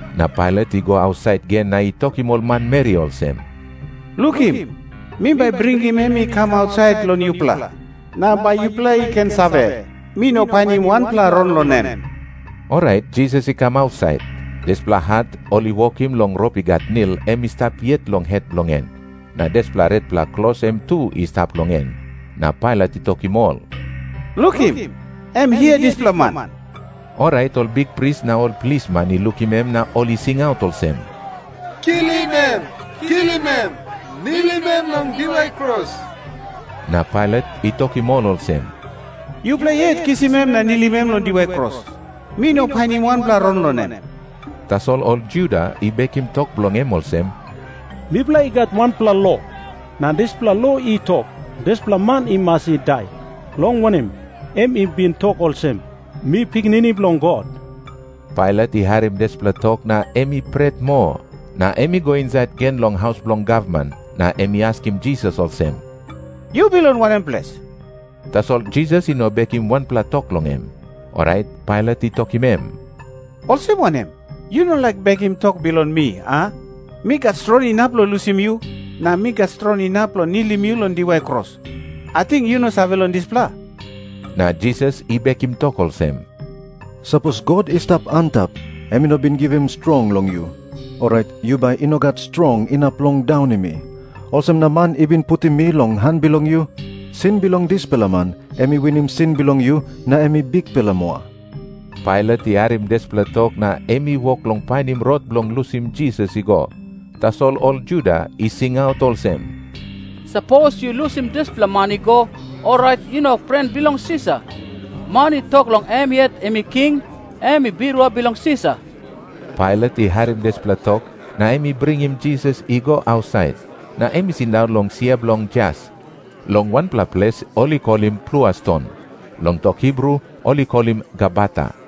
Na Pailat i go ausait gen na i tokim ol manmeri olsem, “Lukim, mi bai bringim em i kam ausait long yupela, na bai yupela i ken save, mi no painim wanpela rong long em.” Orait Jisas i kam ausait. Dispela hat ol i wokim long rop i gat nil, em i stap yet long het bilong en. Na dispela retpela klos em tu i stap long en. Na Pailat i tokim ol, “Lukim. Em hia dispela man.” Orait ol bikpris na ol plisman i lukim em na ol i singaut olsem, “Kilim em! Kilim em! Nilim em long diwai kros!” Na Pailat i tokim ol olsem, “Yupela yet kisim em na nilim em long diwai kros. Mi no painim wanpela rong long em.” Tasol ol Juda i bekim tok bilong em olsem, “Mipela i gat wanpela lo, na dispela lo i tok, dispela man i mas i dai. Long wanem, em i bin tok olsem, ‘Mi Pikinini Bilong God.’” Pailat i harim dispela tok na em i pret moa. Na em i go insait gen long haus bilong gavman, na em i askim Jisas olsem, “Yu bilong wanem ples?” Tasol Jisas i no bekim wanpela tok long em. Orait Pailat i tokim em, “Olsem wanem? Yu no laik bekim tok bilong mi, a? Mi gat strong inap long lusim yu, na mi gat strong inap long nilim yu long diwai kros. Ating yu no save long dispela?” Na Jisas i bekim tok olsem, “Sapos God i stap antap em i no bin givim strong long yu, orait yu bai i no gat strong inap long daunim mi. Olsem na man i bin putim mi long han bilong yu, sin bilong dispela man em i winim sin bilong yu na em i bikpela moa.” Pailat i harim dispela tok na em i wok long painim rot bilong lusim Jisas i go. Tasol ol Juda i singaut olsem, “Sapos yu lusim dispela man i go, orait yu no pren bilong Sisar. Man i tok long em yet em i king, em i birua bilong Sisar.” Pailat i harim dispela tok, na em i bringim Jisas i go ausait. Na em i sindaun long sia bilong jas, long wanpela ples ol i kolim Plua Ston. Long tok Hibru ol i kolim Gabata.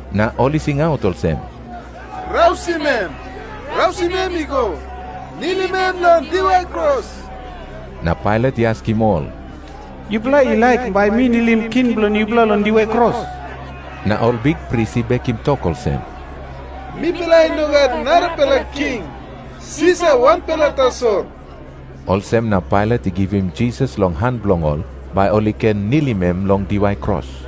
Na ol i singaut olsem, “Rausim em! Rausim em i go! Nilim em long diwai kros!” Na Pailat i askim ol, “Yupela i laik bai mi nilim king bilong yupela long diwai kros?” Na ol bikpris i bekim tok olsem, “Mipela i no gat narapela king. Sisar wanpela tasol!” Olsem na Pailat i givim Jisas long han bilong ol, bai ol i ken nilim em long diwai kros.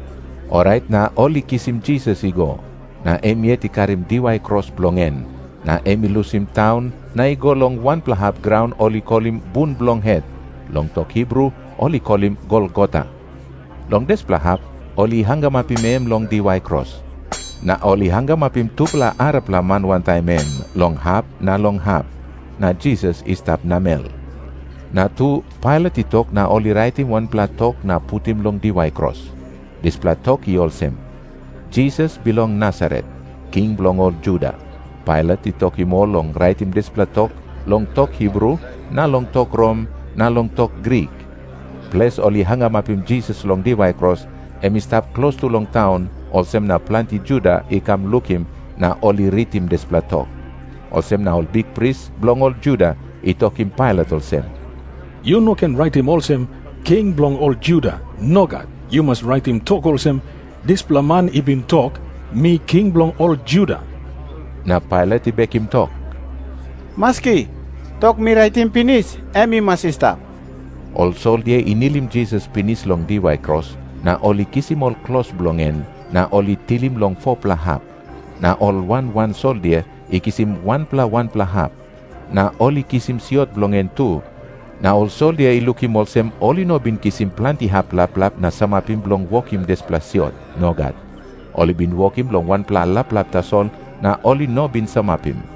Orait na ol i kisim Jisas i go. Na em yet i karim diwai kros bilong en, na em i lusim taun na i go long wanpela hap graun ol i kolim Bun Bilong Het. Long tok Hibru ol i kolim Golgota. Long dispela hap ol i hangamapim em long diwai kros. Na ol i hangamapim tupela arapela man wantaim em, long hap na long hap. Na Jisas i stap namel. Na tu, Pailat i tok na ol i raitim wanpela tok na putim long diwai kros. Dispela tok i olsem, “Jisas bilong Nasaret, king bilong ol Juda.” Pailat i tokim ol long raitim dispela tok long tok Hibru na long tok Rom na long tok Grik. Ples ol i hangamapim Jisas long diwai kros, em i stap klostu long taun, olsem na planti Juda i kam lukim na ol i ritim dispela tok. Olsem na ol bikpris bilong ol Juda i tokim Pailat olsem, “Yu no ken raitim olsem, ‘King bilong ol Juda.’ Nogat. Yu mas raitim tok olsem, ‘Dispela man i bin tok, “Mi king bilong ol Juda.” ’ Na Pailat i bekim tok, “Maski. Tok mi raitim pinis em i mas i stap.” Ol soldia i nilim Jisas pinis long diwai kros, na ol i kisim ol klos bilong en, na ol i tilim long 4-pela hap. Na ol wan wan soldia i kisim wanpela wanpela hap. Na ol i kisim siot bilong en tu, na ol soldia i lukim olsem ol i no bin kisim planti hap laplap na samapim bilong wokim dispela siot. Nogat. Ol i bin wokim long wanpela laplap tasol, na ol i no bin samapim.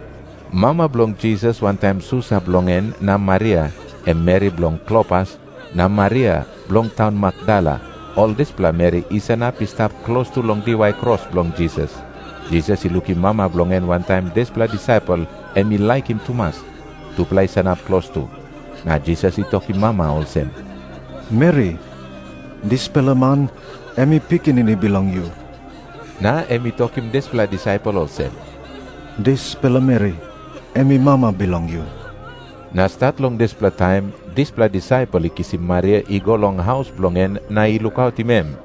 Mama bilong Jisas wantaim susa bilong en na Maria, em meri bilong Klopas, na Maria bilong taun Makdala, ol dispela meri i sanap i stap klostu long diwai kros bilong Jisas. Jisas i lukim mama bilong en wantaim dispela disaipel em i laikim tumas, tupela i sanap klostu. Na Jisas i tokim mama olsem, “Meri, dispela man em i pikinini bilong yu.” Na em i tokim dispela disaipel olsem, “Dispela meri em i mama bilong yu.” Na stat long dispela taim dispela disaipel i kisim Maria i go long haus bilong en na i lukautim em.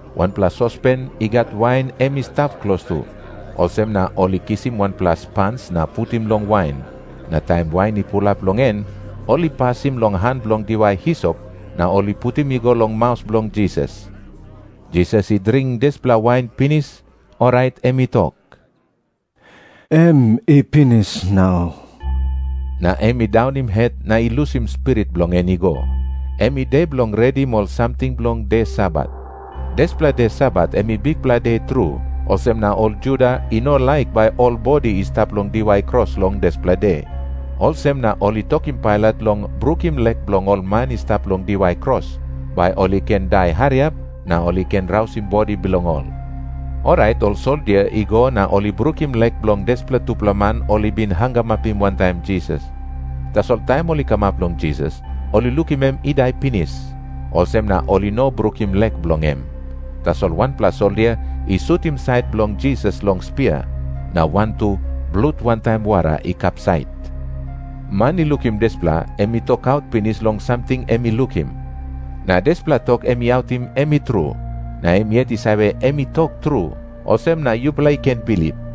Wanpela sospen i gat wain em i stap klostu. Olsem na ol i kisim wanpela spans na putim long wain. Na taim wain i pulap long en, ol i pasim long han bilong diwai hisop na ol i putim i go long maus bilong Jisas. Jisas i dring dispela wain pinis, orait em i tok, “Em i pinis nau,” na em i daunim het na i lusim spirit bilong en i go. Em i de bilong redim ol samting bilong de Sabat. Dispela de Sabat em i bikpela de tru, olsem na ol Juda i no laik bai ol bodi i stap long diwai kros long dispela de. Olsem na ol i tokim Pailat long brukim lek bilong ol man i stap long diwai kros, bai ol i ken dai hariap na ol i ken rausim bodi bilong ol. Orait ol soldia i go na ol i brukim lek bilong dispela tupela man ol i bin hangamapim wantaim Jisas. Tasol taim ol i kamap long Jisas, ol i lukim em i dai pinis. Olsem na ol i no brukim lek bilong em. Tasol wanpela soldia i sutim sait bilong Jisas long spia. Na wantu blut wantaim wara i kapsait. Man i lukim dispela, em i tokaut pinis long samting em i lukim. Na dispela tok em i autim, em i tru. Na em yet i save em i tok tru. Olsem na yupela i ken bilip.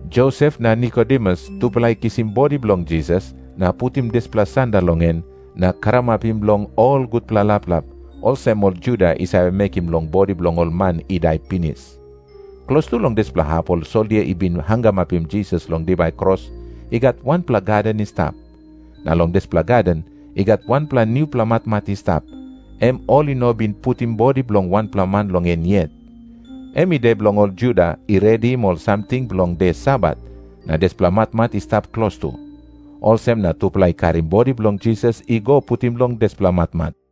Josep na Nikodemus tupela i kisim bodi bilong Jisas, na putim dispela sanda long en, na karamapim long ol gutpela laplap, olsem ol Juda i save mekim long bodi bilong ol man i dai pinis. Klostu long dispela hap ol soldia i bin hangamapim Jisas long diwai kros, i gat wanpela gaden i stap. Na long dispela gaden i gat wanpela nupela matmat i stap, em ol i no bin putim bodi bilong wanpela man long en yet. Em i de bilong ol Juda i redim ol samting bilong de Sabat, na dispela matmat i stap klostu. Olsem na tupela i karim bodi bilong Jisas i go putim long dispela matmat.~